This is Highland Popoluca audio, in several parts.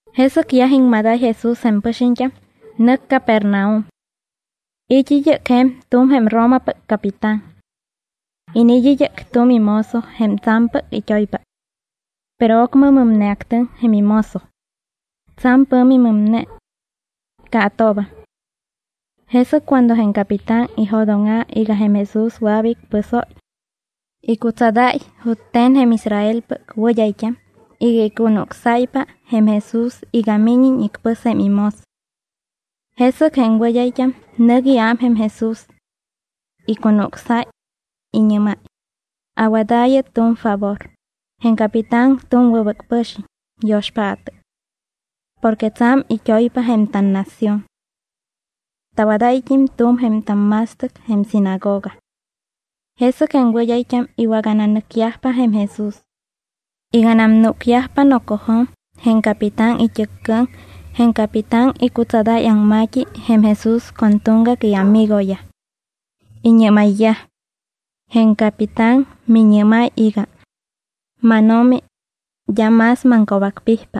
Jesɨc yaj iŋmadáy Jesús jém pɨxiñt́am, nɨc Capernaum. It́ id́ɨc je̱m tu̱m jém Romapɨc capitán. Iniit́ id́ɨc tu̱m imozo jém tsa̱mpɨc it́oypa. Pero ocmɨ mɨmneactɨŋ jém imozo. Tsa̱m pɨ̱mi mɨmne. Caatoobam. Jesɨc cuando jém capitán ijo̱dóŋa̱ iga jém Jesús wɨa̱p icpɨsóy, icutsadáy jute̱n jém Israelpɨc wɨd́ayt́am iga icunucsáypa jém Jesús iga míñiñ icpɨs jém imozo. Jesɨc jém wɨd́ayt́am nɨc iám jém Jesús. Icunucsáy, iñɨ́máy: —Awadaayɨ tu̱m favor, jém capitán tu̱m wɨbɨc pɨ̱xiñ, yo̱xpaatɨ. Porque tsa̱m it́oypa jém tannación. Tawadáyt́im tu̱m jém tamma̱stɨc jém sinagoga. Jesɨc jém wɨd́ayt́am iwagananɨcyajpa jém Jesús. Iganam núcyajpa nocojo̱m jém capitán it́ɨccɨɨm, jém capitán icutsadáy aŋma̱t́i jém Jesús con tuŋgac iamigoyaj. Iñɨ́mayyaj: —Jém capitán miñɨ́máy iga: “MánO̱mi, d́a más maŋco̱bacpijpa.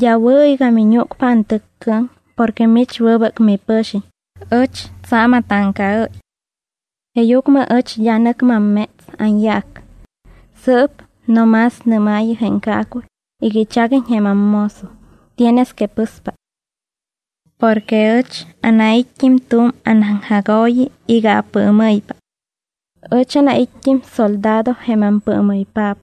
D́a wɨ̱ iga miñúcpa antɨccɨɨm porque mich wɨbɨc mipɨ̱xiñ, ɨch tsa̱m atáŋcaɨ́y.” Jeeyucmɨ ɨch d́a nɨc mamméts anyaac. Sɨɨp no más nɨ́maayɨ jém caacuy iga ichaguiñ jém ammozo, tienes que pɨspa. Porque ɨch anait́t́im tu̱m anaŋjagooyi iga apɨɨmɨ́ypa. Ɨch anait́t́im soldado jém ampɨɨmɨypaap.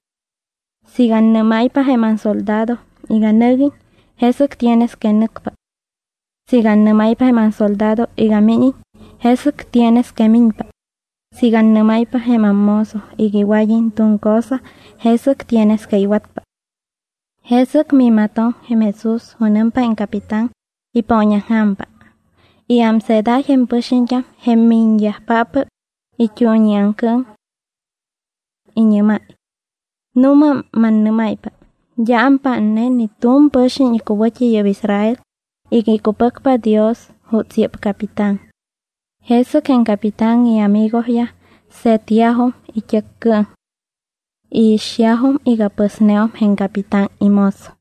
Siiga annɨ́máypa jém ansoldado iga nɨguiñ, jesɨc tienes que nɨcpa. Siiga annɨ́máypa jém ansoldado iga míñiñ, jesɨc tienes que miñpa. Siiga annɨ́máypa jém ammozo iga iwad́iñ tu̱m cosa, jesɨc tienes que iwatpa. Jesɨc miimatoŋ jém Jesús junɨmpa jém capitán, ipooñaŋja̱mpa. Iámseedáy jém pɨxiñt́am jém miñyajpáppɨc it́uuñiaŋcɨɨm. Iñɨ́máy: —Nu̱ma, mannɨ́máypa, d́a ampátne ni tu̱m pɨxiñ icuwɨ̱t́i yɨ́p Israel iga icupɨcpa Dios juuts yɨ́p capitán. Jesɨc jém capitán iamigoyaj se̱tyajum it́ɨccɨɨm. Iixyajum iga pɨsneum jém capitán imozo.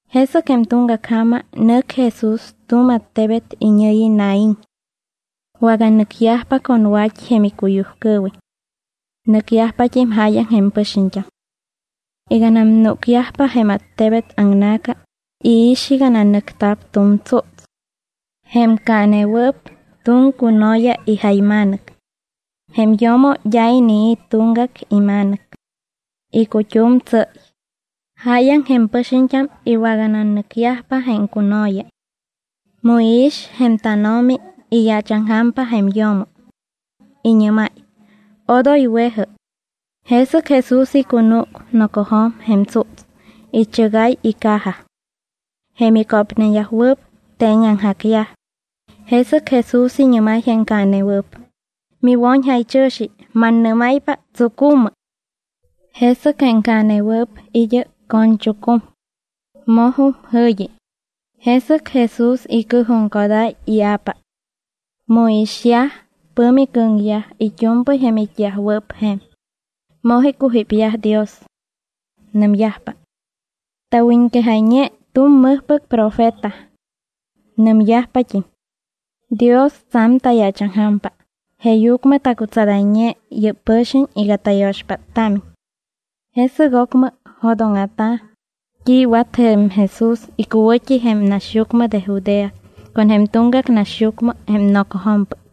Jesɨc jém tuŋgac ja̱ma nɨc Jesús tu̱m attebet iñɨ̱yi Naín. Waganɨcyajpa con wa̱t́i jém icuyujcɨɨwiñ. Nɨcyajpat́im jáyaŋ jém pɨxiñt́am. Iganam núcyajpa jém attebet aŋna̱ca, iix iga nanɨcta̱p tu̱m tsúts. Jém caanewɨɨp tu̱m cuno̱ya ijayma̱nɨc. Jém yo̱mo d́a inii̱ tuŋgac ima̱nɨc. Icut́um tsɨ́y. Jáyaŋ jém pɨxiñt́am iwagananɨcyajpa jém cuno̱ya. Mu iix jém tánO̱mi, iyaachaŋja̱mpa jém yo̱mo. Iñɨ́máy: —Odoy we̱jɨ. Jesɨc Jesús icunúc nocojo̱m jém tsúts, ichɨgáy icaja. Jém icópneyajwɨɨp teeñaŋjacyaj. Jesɨc Jesús iñɨ́máy jém caanewɨɨp: —¡Miwo̱ñjaychɨ̱xi, mannɨ́máypa, tsucu̱mɨ! Jesɨc jém caanewɨɨp id́ɨc co̱ñchucum. Mojum jɨ̱yi. Jesɨc Jesús icɨɨjuŋcodáy ia̱pa. Mu iixyaj, pɨ̱mi cɨ̱ŋyaj it́u̱mpɨy jém it́yajwɨɨp je̱m. Moj icujípyaj Dios. Nɨmyajpa: —Tawiñquejayñe tu̱m mɨjpɨc profeta. Nɨmyajpat́im: —Dios tsa̱m tayaachaŋja̱mpa, jeeyucmɨ tacutsadayñe yɨ́p pɨxiñ iga tayo̱xpáttámiñ. Jesɨc ocmɨ jo̱dóŋa̱ta̱ t́i iwat jém Jesús icuwɨ̱t́i jém naxyucmɨ de Judea con jém tuŋgac naxyucmɨ jém nocojo̱mpɨc.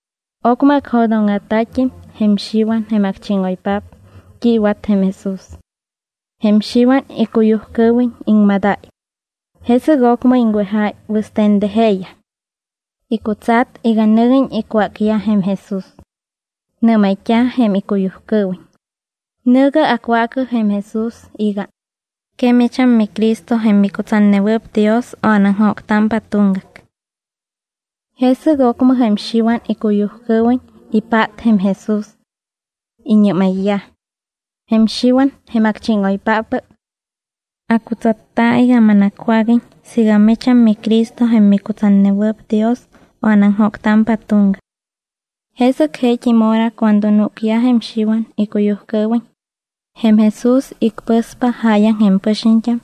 Ocmɨ acjo̱dóŋa̱ta̱t́im jém Xiwan jém acchíŋoypaap t́i iwat jém Jesús. Jém Xiwan icuyujcɨɨwiñ iŋmadáy. Jesɨc ocmɨ iŋwejáy wɨste̱n de jeeyaj. Icutsat iga nɨguiñ icwácyaj jém Jesús. Nɨ́mayt́a̱ jém icuyujcɨɨwiñ: —Nɨ̱gɨ acwaacɨ jém Jesús iga: “¿Que micham miCristo jém micutsatnewɨɨp Dios o anaŋjóctámpa tuŋgac?” Jesɨc ocmɨ jém Xiwan icuyujcɨɨwiñ ipát jém Jesús. Iñɨ́mayyaj: —Jém Xiwan, jém acchíŋoypáppɨc, acutsatta iga manacwáguiñ siiga micham miCristo jém micutsatnewɨɨp Dios o anaŋjóctámpa tuŋgac. Jesɨc jeet́im hora cuando núcyaj jém Xiwan icuyujcɨɨwiñ, jém Jesús icpɨspa jáyaŋ jém pɨxiñt́am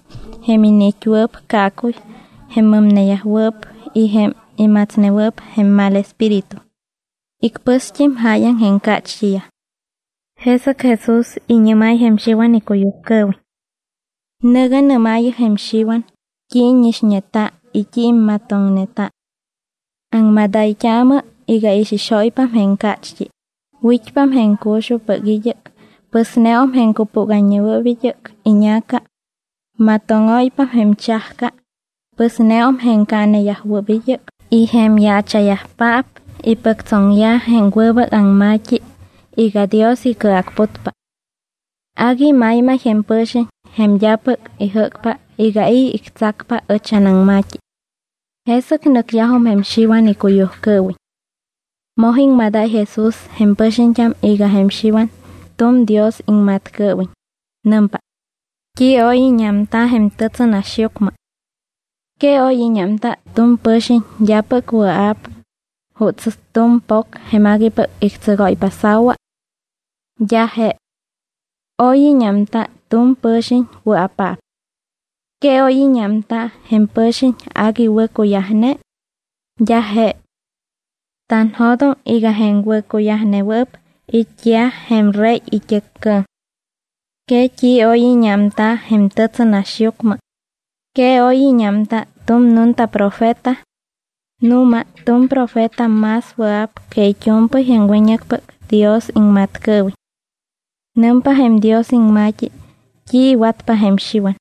jém iniit́wɨɨp caacuy, jém mɨmneyajwɨɨp y jém imatsnewɨɨp jém mal espíritu. Icpɨst́im jáyaŋ jém cácht́iyaj. Jesɨc Jesús iñɨ́máy jém Xiwan icuyujcɨɨwiñ: —Nɨ̱gɨ nɨ́maayɨ jém Xiwan t́i íñixñeta y t́i immatoŋneta. Aŋmadayt́aamɨ iga ixixóypam jém cácht́i, wit́pam jém cuxujpɨc id́ɨc, pɨsneum jém cupúgayñewɨɨp id́ɨc iña̱ca, matóŋóypam jém chajca, pɨsneum jém caaneyajwɨɨp id́ɨc y jém yaacha̱yajpaap ipɨctsoŋyaj jém wɨbɨc aŋma̱t́i iga Dios icɨacputpa. Agui maymay jém pɨ̱xiñ jém d́apɨc ijɨ́cpa iga i̱ ictsacpa ɨch anaŋma̱t́i. Jesɨc nɨcyajum jém Xiwan icuyujcɨɨwiñ. Moj iŋmadáy Jesús jém pɨxiñt́am iga jém Xiwan tu̱m Dios iŋmat́cɨɨwiñ. Nɨmpa: —¿T́i oy íñámta jém tɨtsɨnaxyucmɨ? ¿Que oy íñámta tu̱m pɨ̱xiñ d́apɨc wɨa̱p juuts tu̱m po̱c jém aguipɨc ictsɨgóypa sa̱wa? D́a je. Oy íñámta tu̱m pɨ̱xiñ wɨa̱paap. ¿Que oy íñámta jém pɨ̱xiñ agui wɨ̱cuyajne? D́a je. Tanjo̱doŋ iga jém wɨ̱cuyajnewɨɨp it́yaj jém rey it́ɨccɨɨm. ¿Que t́i oy íñámta jém tɨtsɨnaxyucmɨ? ¿Que oy íñámta tu̱m nunta profeta? Nu̱ma tu̱m profeta más wɨa̱p que it́u̱mpɨy jém wiñɨcpɨc Dios iŋmat́cɨɨwiñ. Nɨmpa jém Dios iŋma̱t́i t́i iwatpa jém Xiwan: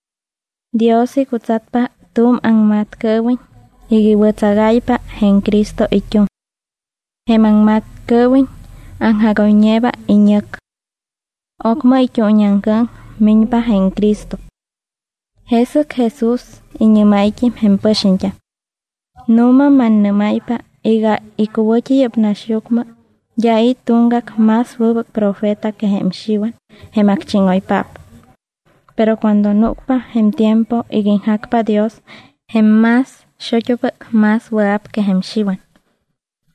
Dios icutsatpa tu̱m aŋmat́cɨɨwiñ iga iwɨ̱tsagáypa jém Cristo it́uŋ. Jém aŋmat́cɨɨwiñ aŋjagoyñeeba iñɨc. Ocmɨ it́uuñiaŋcɨɨm miñpa jém Cristo. Jesɨc Jesús iñɨ́máyt́im jém pɨxiñt́am: —Nu̱ma mannɨ́máypa iga icuwɨ̱t́i yɨ́p naxyucmɨ d́a i̱ tuŋgac más wɨbɨc profeta que jém Xiwan jém acchíŋoypaap. Pero cuando núcpa jém tiempo iga iŋjacpa Dios, jém más xut́upɨc más wɨa̱p que jém Xiwan.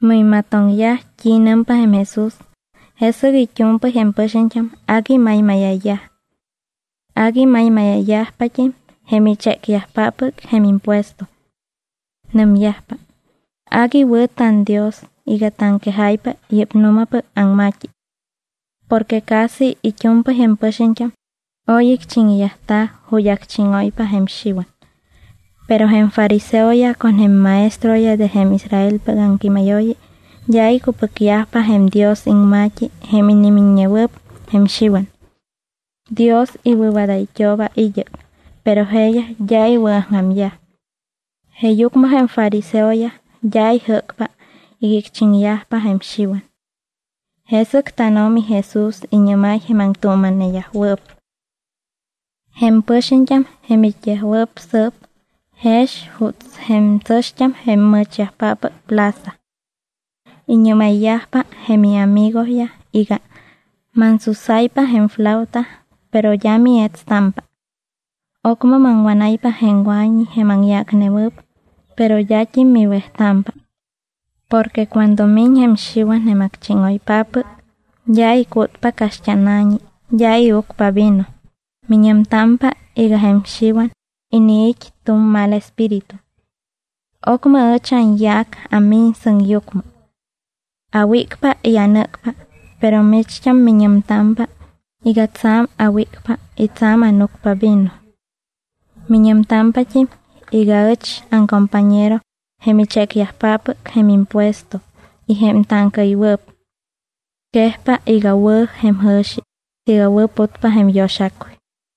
Mu imatoŋyaj t́i nɨmpa jém Jesús, jesɨc it́u̱mpɨy jém pɨxiñt́am agui maymáya̱yaj. Agui maymáya̱yajpat́im jém ichécyajpáppɨc jém impuesto. Nɨmyajpa: —Agui wɨ̱ tanDios iga taŋquejáypa yɨ́p nu̱mapɨc aŋma̱t́i. Porque casi it́u̱mpɨy jém pɨxiñt́am oy icchiŋyajta̱ ju̱t́ acchíŋóypa jém Xiwan. Pero jém fariseoyaj con jém maestroyaj de jém Israelpɨc aŋquímayooyi d́a icupɨcyajpa jém Dios iŋma̱t́i jém inimiññewɨɨp jém Xiwan. Dios iwɨ̱wadayt́ooba id́ɨc, pero jeeyaj d́a iwɨ̱aŋja̱myaj. Jeeyucmɨ jém fariseoyaj d́a ijɨ́cpa iga icchiŋyajpa jém Xiwan. Jesɨc tánO̱mi Jesús iñɨ́máy jém aŋtuuma̱neyajwɨɨp: —Jém pɨxiñt́am jém it́yajwɨɨp sɨɨp jex juuts jém tsɨ̱xt́am jém mɨ̱chyajpáppɨc plaza. Iñɨ́mayyajpa jém iamigoyaj iga: “Mansusáypa jém flauta, pero d́a mietstámpa. Ocmɨ maŋwánáypa jém wa̱ñi jém aŋyácnewɨɨp, pero d́at́im miwejtámpa.” Porque cuando miñ jém Xiwan jém acchíŋoypáppɨc, d́a icútpa caxt́ána̱ñi, d́a iucpa vino; miñɨmtámpa iga jém Xiwan iniit́ tu̱m mal espíritu. Ocmɨ ɨch anyaac amiñ sɨŋyucmɨ. Awícpa y anɨ́cpa, pero micht́am miñɨmtámpa iga tsa̱m awícpa y tsa̱m ánucpa vino. Miñɨmtámpat́im iga ɨch aŋcompañero jém ichécyajpáppɨc jém impuesto y jém táŋcaɨywɨɨp. Quejpa iga wɨ̱ jém jɨ̱xi siiga wɨ̱putpa jém yo̱xacuy.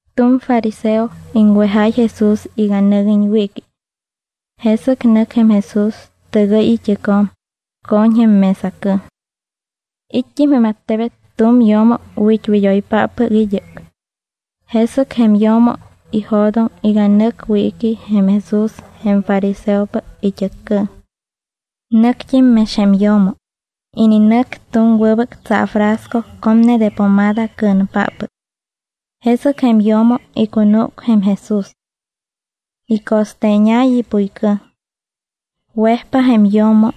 Tu̱m fariseo iŋwejáy Jesús iga nɨguiñ wiiqui. Jesɨc nɨc jém Jesús, tɨgɨy it́ɨcjo̱m, co̱ñ jém mesacɨɨm. It́t́im jém attebet tu̱m yo̱mo wit́wid́oypáppɨc id́ɨc. Jesɨc jém yo̱mo ijo̱doŋ iga nɨc wiiqui jém Jesús jém fariseopɨc it́ɨccɨɨm. Nɨct́im mex jém yo̱mo. Ininɨc tu̱m wɨbɨc tsaafrasco comne de pomada cɨ̱npáppɨc. Jesɨc jém yo̱mo icunúc jém Jesús. Ico̱steeñáy ipuycɨɨm. Wejpa jém yo̱mo.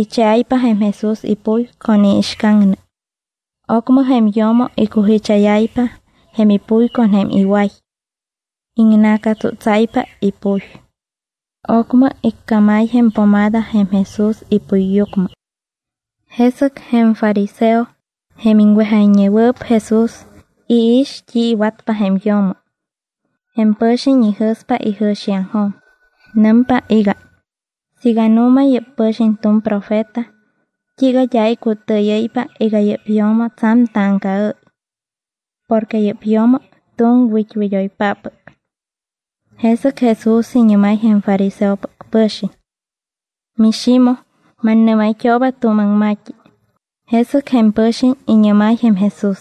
Icheáypa jém Jesús ipuy con iixcaŋnɨ. Ocmɨ jém yo̱mo icujicháyáypa jém ipuy con jém iway. Iŋna̱catsútsáypa ipuy. Ocmɨ icámáy jém pomada jém Jesús ipuyyucmɨ. Jesɨc jém fariseo, jém iŋwejayñewɨɨp Jesús, iix t́i iwatpa jém yo̱mo. Jém pɨ̱xiñ ijɨ̱spa ijɨ̱xiaŋjo̱m. Nɨmpa iga: “Siiga nu̱ma yɨ́p pɨ̱xiñ tu̱m profeta, ¿t́iiga d́a icutɨɨyɨ́ypa iga yɨ́p yo̱mo tsa̱m táŋcaɨ́y? Porque yɨ́p yo̱mo tu̱m wit́wid́oypáppɨc.” Jesɨc Jesús iñɨ́máy jém fariseopɨc pɨ̱xiñ: —MiXimoj, mannɨ́mayt́ooba tu̱m aŋma̱t́i: Jesɨc jém pɨ̱xiñ iñɨ́máy jém Jesús: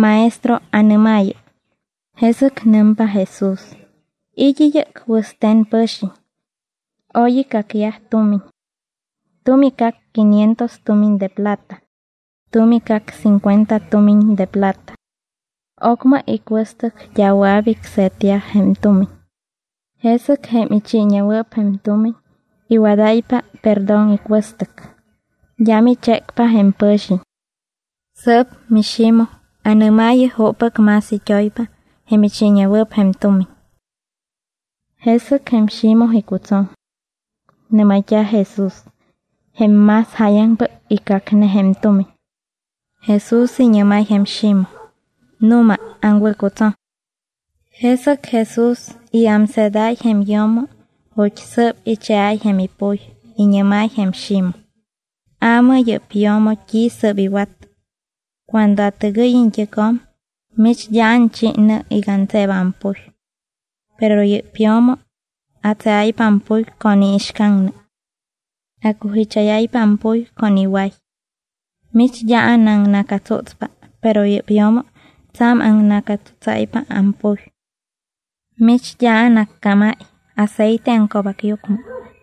—Maestro, anɨ́maayɨ. Jesɨc nɨmpa Jesús: —It́ id́ɨc wɨste̱n pɨ̱xiñ. Oy icacyaj tumiñ. Tu̱m icac quinientos tumiñ de plata, tu̱m icac cincuenta tumiñ de plata. Ocmɨ icuɨstɨc d́a wɨa̱p icse̱tyaj jém tumiñ. Jesɨc jém ichiiñewɨɨp jém tumiñ iwadáypa perdón icuɨstɨc. D́am ichécpa jém pɨ̱xiñ. Sɨɨp, miXimoj, ¿anɨ́maayɨ juppɨc más it́oypa jém ichiiñewɨɨp jém tumiñ? Jesɨc jém Ximoj icutsoŋ. Nɨ́mayt́a̱ Jesús: —Jém más jáyaŋpɨc icacne jém tumiñ. Jesús iñɨ́máy jém Ximoj: —Nu̱ma, aŋwɨ̱cutsoŋ. Jesɨc Jesús iámseedáy jém yo̱mo ju̱t́ sɨɨp icheáy jém ipuy, iñɨ́máy jém Ximoj: —Aamɨ yɨ́p yo̱mo t́i sɨ́p iwat. Cuando atɨgɨy iñt́ɨcjo̱m mich d́a anchi nɨ iga antseeba ampuy. Pero yɨ́p yo̱mo atseáypa ampuy con iixcaŋnɨ. Acujicháyáypa ampuy con iway. Mich d́a anaŋna̱catsútspa, pero yɨ́p yo̱mo tsa̱m aŋna̱catsútsáypa ampuy. Mich d́a anaccámáy aceite aŋco̱bacyucmɨ,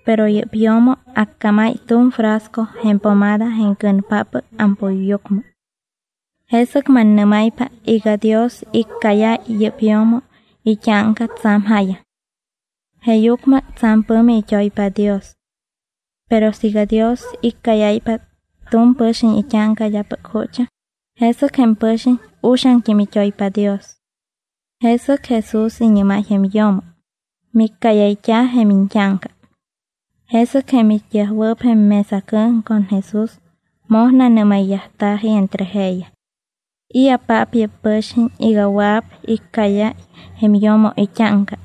pero yɨ́p yo̱mo acámáy tu̱m frasco jém pomada jém cɨ̱npáppɨc ampuyyucmɨ. Jesɨc mannɨ́máypa iga Dios iccáyáy yɨ́p yo̱mo it́áŋca tsa̱m jáyaŋ. Jeeyucmɨ tsa̱m pɨ̱mi it́oypa Dios. Pero siiga Dios iccáyáypa tu̱m pɨ̱xiñ it́áŋca d́apɨc jutsaŋ, jesɨc jém pɨ̱xiñ uxaŋt́im it́oypa Dios. Jesɨc Jesús iñɨ́máy jém yo̱mo: —Miccáyayt́a̱ jém iñt́áŋca. Jesɨc jém it́yajwɨɨp jém mesacɨɨm con Jesús moj nanɨ́mayyajta̱ji entre jeeyaj: —¿I̱apaap yɨ́p pɨ̱xiñ iga wɨa̱p iccáyáy jém yo̱mo it́áŋca?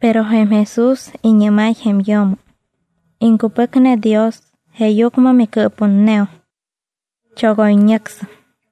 Pero jém Jesús iñɨ́máy jém yo̱mo: —Iŋcupɨcne Dios jeeyucmɨ micɨɨputneum. Chogoyñɨcsɨm.